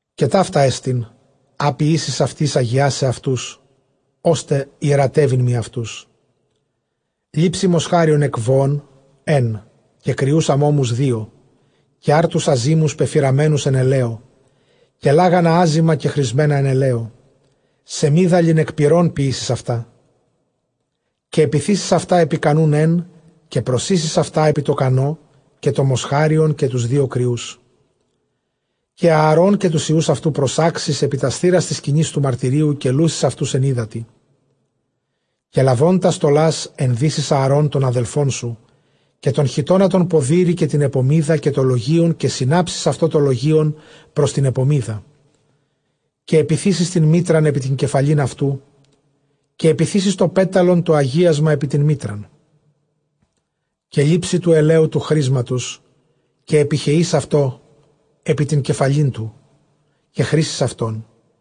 Καὶ ταῦτά ἐστιν, ἃ ποιήσεις αὐτοῖς· ἁγιάσεις αὐτοὺς, ὥστε ἱερατεύειν μοι αὐτούς· λήψῃ δὲ μοσχάριον ἐκ βοῶν ἓν, καὶ κριοὺς ἀμώμους δύο, καὶ ἄρτους ἀζύμους πεφυραμένους ἑν ἐλαίῳ, καὶ λάγανα ἄζυμα κεχρισμένα ἐν ἐλαίῳ· σεμίδαλιν ἐκ πυρῶν ποιήσεις αὐτά. Καὶ ἐπιθήσεις αὐτὰ ἐπὶ κανοῦν ἕν· καὶ προσοίσεις αὐτὰ ἐπὶ τῷ κανῷ· καὶ τὸ μοσχάριον, καὶ τοὺς δύο κριούς. Καὶ Ἀαρὼν καὶ τοὺς υἱοὺς αὐτοῦ προσάξεις ἐπὶ τὰς θύρας τῆς σκηνῆς τοῦ μαρτυρίου, καὶ λούσεις αὐτοὺς ἐν ὕδατι. Καὶ λαβὼν τὰς στολὰς, ἐνδύσεις Ἀαρὼν τὸν ἀδελφόν σου καὶ τὸν χιτῶνα τὸν ποδήρη, καὶ τὴν ἐπωμίδα, καὶ τὸ λογεῖον· καὶ συνάψεις αὐτῷ τὸ λογεῖον πρὸς τὴν ἐπωμίδα. Καὶ ἐπιθήσεις τὴν μίτραν ἐπὶ τὴν κεφαλὴν αὐτοῦ, καὶ ἐπιθήσεις τὸ πέταλον τὸ ἁγίασμα ἐπὶ τὴν μίτραν. Καὶ λήψῃ τοῦ ἐλαίου τοῦ χρίσματος· καὶ ἐπιχεεῖς αὐτὸ ἐπὶ τὴν κεφαλὴν αὐτοῦ, καὶ χρίσεις αὐτόν.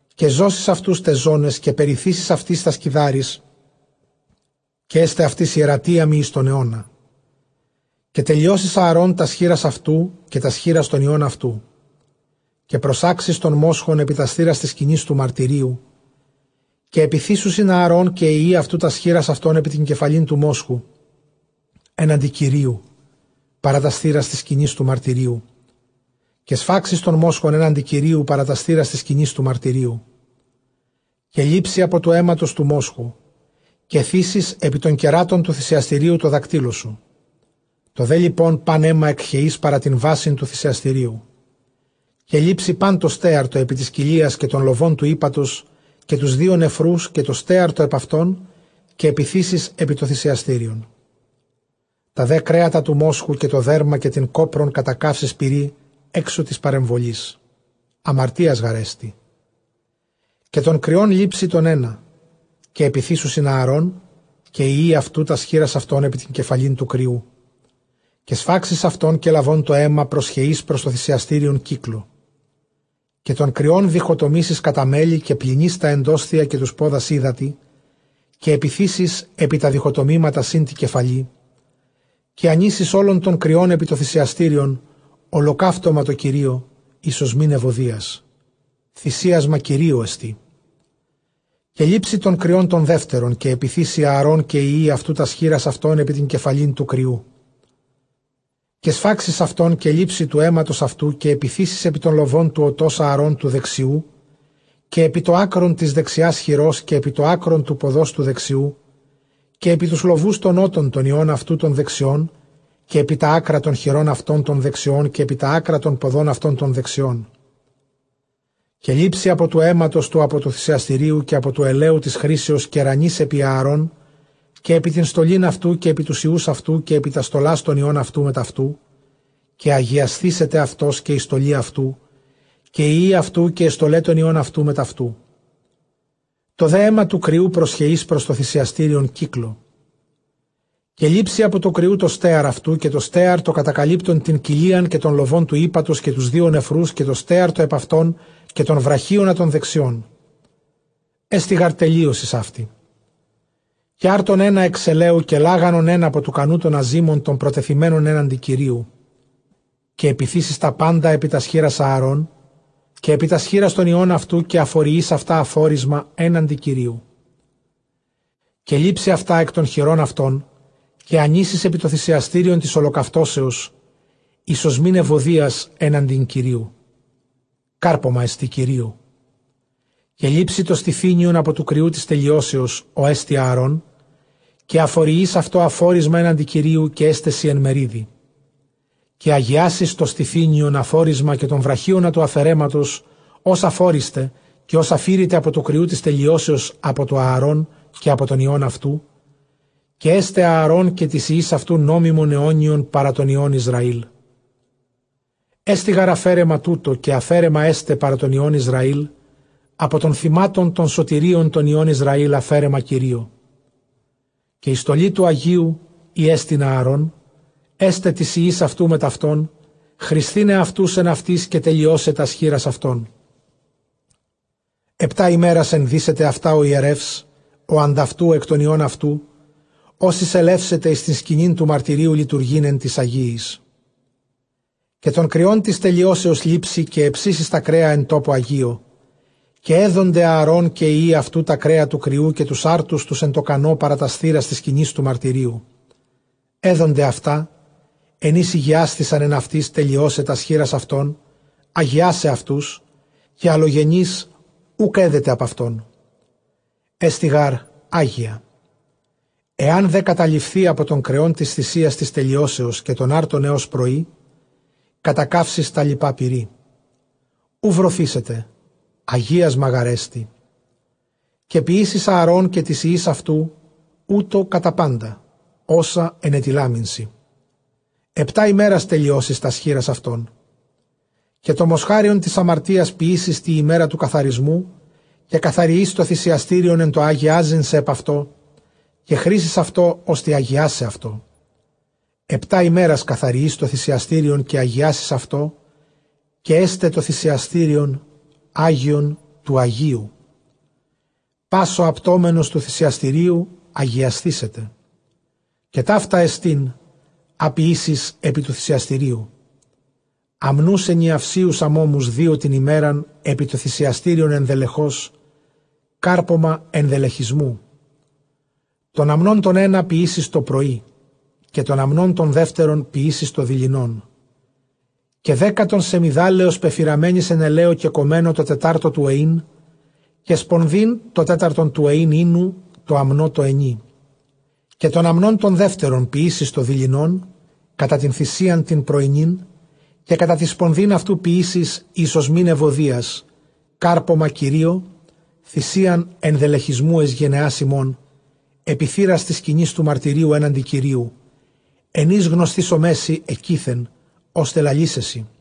Καὶ ζώσεις αὐτοὺς ταῖς ζωναῖς, καὶ περιθήσεις αὐτοῖς τὰς κιδάρεις· καὶ ἔσται αὐτοῖς ἱερατῖα μοι εἰς τὸν αἰῶνα· καὶ τελειώσεις Ἀαρὼν τὰς χεῖρας αὐτοῦ, καὶ τὰς χεῖρας τῶν υἱῶν αὐτοῦ. Καὶ προσάξεις τὸν μόσχον ἐπὶ τὰς θύρας τῆς σκηνῆς τοῦ μαρτυρίου· καὶ ἐπιθήσουσιν Ἀαρὼν καὶ οἱ υἱοὶ αὐτοῦ τὰς χεῖρας αὐτῶν ἐπὶ τὴν κεφαλὴν τοῦ μόσχου, ἔναντι Κυρίου, παρὰ τὰς θύρας τῆς σκηνῆς τοῦ μαρτυρίου. Καὶ σφάξεις τὸν μόσχον ἔναντι Κυρίου, παρὰ τὰς θύρας τῆς σκηνῆς τοῦ μαρτυρίου. Καὶ λήψῃ ἀπὸ τοῦ αἵματος τοῦ μόσχου, καὶ θήσεις ἐπὶ τῶν κεράτων τοῦ θυσιαστηρίου τῷ δακτύλῳ σου· τὸ δὲ λοιπὸν πᾶν αἷμα ἐκχεεῖς παρὰ τὴν βάσιν τοῦ θυσιαστηρίου. Καὶ λήψῃ πᾶν τὸ στέαρ τὸ ἐπὶ τῆς κοιλίας, καὶ τὸν λοβὸν τοῦ ἥπατος, καὶ τοὺς δύο νεφροὺς, καὶ τὸ στέαρ τὸ ἐπʼ αὐτῶν, καὶ ἐπιθήσεις ἐπὶ τὸ θυσιαστήριον. Τὰ δὲ κρέατα τοῦ μόσχου, καὶ τὸ δέρμα, καὶ τὴν κόπρον κατακαύσεις πυρὶ ἔξω τῆς παρεμβολῆς· ἁμαρτίας γάρ ἐστι. Καὶ τὸν κριὸν λήψῃ τὸν ἕνα, καὶ ἐπιθήσουσιν Ἀαρὼν καὶ οἱ υἱοὶ αὐτοῦ τὰς χεῖρας αὐτῶν ἐπὶ τὴν κεφαλὴν τοῦ κριοῦ. Καὶ σφάξεις αὐτὸν, καὶ λαβὼν τὸ αἷμα προσχεεῖς πρὸς τὸ θυσιαστήριον κύκλῳ. Καὶ τὸν κριὸν διχοτομήσεις κατὰ μέλη· καὶ πλυνεῖς τὰ ἐνδόσθια καὶ τοὺς πόδας ὕδατι, καὶ ἐπιθήσεις ἐπὶ τὰ διχοτομήματα σὺν τῇ κεφαλῇ. Καὶ ἀνοίσεις ὅλον τὸν κριὸν ἐπὶ τὸ θυσιαστήριον, ὁλοκαύτωμα τῷ Κυρίῳ εἰς ὀσμὴν εὐωδίας· θυμίαμα Κυρίῳ ἐστί. Καὶ λήψῃ τὸν κριὸν τὸν δεύτερον, καὶ ἐπιθήσει Ἀαρὼν καὶ οἱ υἱοὶ αὐτοῦ τὰς χεῖρας αὐτῶν ἐπὶ τὴν κεφαλὴν τοῦ κριοῦ. Καὶ σφάξεις αὐτὸν, καὶ λήψῃ τοῦ αἵματος αὐτοῦ, καὶ ἐπιθήσεις ἐπὶ τὸν λοβὸν τοῦ ὠτὸς Ἀαρὼν τοῦ δεξιοῦ, καὶ ἐπὶ τὸ ἄκρον τῆς δεξιᾶς χειρὸς, καὶ ἐπὶ τὸ ἄκρον τοῦ ποδὸς τοῦ δεξιοῦ, καὶ ἐπὶ τοὺς λοβοὺς τῶν ὤτων τῶν υἱῶν αὐτοῦ τῶν δεξιῶν, καὶ ἐπὶ τὰ ἄκρα τῶν χειρῶν αὐτῶν τῶν δεξιῶν, καὶ ἐπὶ τὰ ἄκρα τῶν ποδῶν αὐτῶν τῶν δεξιῶν. Καὶ λήψῃ ἀπὸ τοῦ αἵματος τοῦ ἀπὸ τοῦ θυσιαστηρίου, καὶ ἀπὸ τοῦ ἐλαίου τῆς χρίσεως, καὶ ῥανεῖς ἐπὶ Ἀαρὼν καὶ ἐπὶ τὴν στολὴν αὐτοῦ, καὶ ἐπὶ τοὺς υἱοὺς αὐτοῦ καὶ ἐπὶ τὰς στολὰς τῶν υἱῶν αὐτοῦ μετʼ αὐτοῦ· καὶ ἁγιασθήσεται αὐτὸς καὶ ἡ στολὴ αὐτοῦ, καὶ οἱ υἱοὶ αὐτοῦ καὶ αἱ στολαὶ τῶν υἱῶν αὐτοῦ μετʼ αὐτοῦ· τὸ δὲ αἷμα τοῦ κριοῦ προσχεεῖς πρὸς τὸ θυσιαστήριον κύκλῳ. Καὶ λήψῃ ἀπὸ τοῦ κριοῦ τὸ στέαρ αὐτοῦ, καὶ τὸ στέαρ τὸ κατακαλύπτον τὴν κοιλίαν, καὶ τὸν λοβὸν τοῦ ἥπατος, καὶ τοὺς δύο νεφροὺς, καὶ τὸ στέαρ τὸ ἐπʼ αὐτῶν, καὶ τὸν βραχίονα τὸν δεξιόν· ἔστι γὰρ τελείωσις αὕτη. Καὶ ἄρτον ἕνα ἐξ ἐλαίου, καὶ λάγανον ἓν ἀπὸ τοῦ κανοῦ τῶν ἀζύμων τῶν προτεθειμένων ἔναντι Κυρίου. Καὶ ἐπιθήσεις τὰ πάντα ἐπὶ τὰς χεῖρας Ἀαρὼν, καὶ ἐπὶ τὰς χεῖρας τῶν υἱῶν αὐτοῦ· καὶ ἀφοριεῖς αὐτὰ ἀφόρισμα ἔναντι Κυρίου. Καὶ λήψῃ αὐτὰ ἐκ τῶν χειρῶν αὐτῶν, καὶ ἀνοίσεις ἐπὶ τὸ θυσιαστήριον τῆς ὁλοκαυτώσεως εἰς ὀσμὴν εὐωδίας ἔναντι Κύριου· κάρπωμά ἐστι Κυρίῳ. Καὶ λήψῃ τὸ στηθύνιον ἀπὸ τοῦ κριοῦ τῆς τελειώσεως, ὅ ἐστιν Ἀαρών· καὶ ἀφοριεῖς αὐτὸ ἀφόρισμα ἔναντι Κυρίου· καὶ ἔσται σοι ἐν μερίδι. Καὶ ἁγιάσεις τὸ στηθύνιον ἀφόρισμα, καὶ τὸν βραχίονα τοῦ ἀφαιρέματος, ὃς ἀφώρισται, καὶ ὃς ἀφῄρηται ἀπὸ τοῦ κριοῦ τῆς τελειώσεως ἀπὸ τοῦ Ἀαρὼν, καὶ ἀπὸ τῶν υἱῶν αὐτοῦ. Καὶ ἔσται Ἀαρὼν καὶ τοῖς υἱοῖς αὐτοῦ νόμιμον αἰώνιον παρὰ τῶν υἱῶν Ἰσραήλ· ἔστι γὰρ ἀφόρισμα τοῦτο· καὶ ἀφαίρεμα ἕσται παρὰ τῶν υἱῶν Ἰσραὴλ ἀπὸ τῶν θυμάτων τῶν σωτηρίων τῶν υἱῶν Ἰσραὴλ, ἀφαίρεμα Κυρίῳ. Καὶ ἡ στολὴ τοῦ ἁγίου, ἥ ἐστιν Ἀαρὼν, ἔσται τοῖς υἱοῖς αὐτοῦ μετʼ αὐτὸν, χρισθῆναι αὐτοὺς ἐν αὐτοῖς, καὶ τελειῶσαι τὰς χεῖρας αὐτῶν. Ἑπτὰ ἡμέρας ἐνδύσεται αὐτὰ ὁ ἱερεὺς ὁ ἀντʼ αὐτοῦ ἐκ τῶν υἱῶν αὐτοῦ, ὃς εἰσελεύσεται εἰς τὴν σκηνὴν τοῦ μαρτυρίου λειτουργεῖν ἐν τοῖς ἁγίοις. Καὶ τὸν κριὸν τῆς τελειώσεως λήψῃ· καὶ ἑψήσεις τὰ κρέα ἐν τόπῳ ἁγίῳ. Καὶ ἔδονται Ἀαρὼν καὶ οἱ υἱοὶ αὐτοῦ τὰ κρέα τοῦ κριοῦ, καὶ τοὺς ἄρτους τοὺς ἐν τῷ κανῷ, παρὰ τὰς θύρας τῆς σκηνῆς τοῦ μαρτυρίου. Ἔδονται αὐτὰ ἐν οἷς ἡγιάσθησαν ἐν αὐτοῖς τελειῶσαι τὰς χεῖρας αὐτῶν, ἁγιάσαι αὐτούς· καὶ ἀλλογενὴς οὐκ ἔδεται ἀπʼ αὐτῶν· ἔστι γὰρ ἅγια. Ἐὰν δὲ καταλειφθῇ ἀπὸ τῶν κρεῶν τῆς θυσίας τῆς τελειώσεως καὶ τῶν ἄρτων ἕως πρωῒ, κατακαύσεις τὰ λοιπὰ πυρί· οὐ βρωθήσεται· ἁγίασμα γάρ ἐστι. Καὶ ποιήσεις Ἀαρὼν καὶ τοῖς υἱοῖς αὐτοῦ οὕτω κατὰ πάντα ὅσα ἐνετειλάμην σοι· ἑπτὰ ἡμέρας τελειώσεις τὰς χεῖρας αὐτῶν. Καὶ τὸ μοσχάριον τῆς ἁμαρτίας ποιήσεις τῇ ἡμέρᾳ τοῦ καθαρισμοῦ· καὶ καθαριεῖς τὸ θυσιαστήριον ἐν τῷ ἁγιάζειν σε ἐπʼ αὐτῷ· καὶ χρίσεις αὐτὸ ὥστε ἁγιάσαι αὐτό. Ἑπτὰ ἡμέρας καθαριεῖς τὸ θυσιαστήριον, καὶ ἁγιάσεις αὐτό· καὶ ἔσται τὸ θυσιαστήριον, ἅγιον τοῦ ἁγίου· πᾶς ὁ ἁπτόμενος τοῦ θυσιαστηρίου, ἁγιασθήσεται. Καὶ ταῦτά ἐστιν, ἃ ποιήσεις ἐπὶ τοῦ θυσιαστηρίου· ἀμνοὺς ἐνιαυσίους ἀμώμους δύο τὴν ἡμέραν ἐπὶ τὸ θυσιαστήριον ἐνδελεχῶς, κάρπωμα ἐνδελεχισμοῦ. Τὸν ἀμνὸν τὸν ἕνα ποιήσεις τὸ πρωῒ, καὶ τὸν ἀμνὸν τὸν δεύτερον ποιήσεις τὸ δειλινόν. Καὶ δέκατον σεμιδάλεως πεφυραμένης ἐν ἐλαίῳ κεκομμένῳ τῷ τετάρτῳ τοῦ εἴν· καὶ σπονδὴν τὸ τέταρτον τοῦ εἲν οἴνου τῷ ἀμνῷ τῷ ἑνί. Καὶ τὸν ἀμνὸν τὸν δεύτερον ποιήσεις τὸ δειλινὸν, κατὰ τὴν θυσίαν τὴν πρωϊνὴν, καὶ κατὰ τὴν σπονδὴν αὐτοῦ· ποιήσεις εἰς ὀσμὴν εὐωδίας κάρπωμα Κυρίῳ, θυσίαν ἐνδελεχισμοῦ εἰς γενεὰς ὑμῶν, ἐπὶ θύρας τῆς σκηνῆς τοῦ μαρτυρίου ἔναντι Κυρίου, ἐν οἷς γνωσθήσομαί σοι ἐκεῖθεν, ὥστε λαλῆσαί σοι.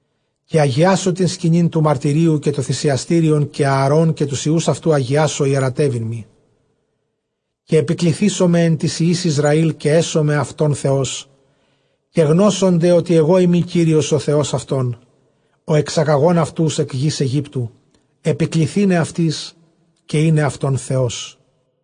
Καὶ ἁγιάσω τὴν σκηνὴν τοῦ μαρτυρίου, καὶ τὸ θυσιαστήριον· καὶ Ἀαρὼν καὶ τοὺς υἱοὺς αὐτοῦ ἁγιάσω, ἱερατεύειν μοι. Καὶ ἐπικληθήσομαι ἐν τοῖς υἱοῖς Ἰσραὴλ, καὶ ἔσομαι αὐτῶν Θεός. Καὶ γνώσονται, ὅτι ἐγώ εἰμι Κύριος ὁ Θεὸς αὐτῶν, ὁ ἐξαγαγὼν αὐτοὺς ἐκ γῆς Αἰγύπτου, ἐπικληθῆναι αὐτοῖς, καὶ εἶναι αὐτῶν Θεός.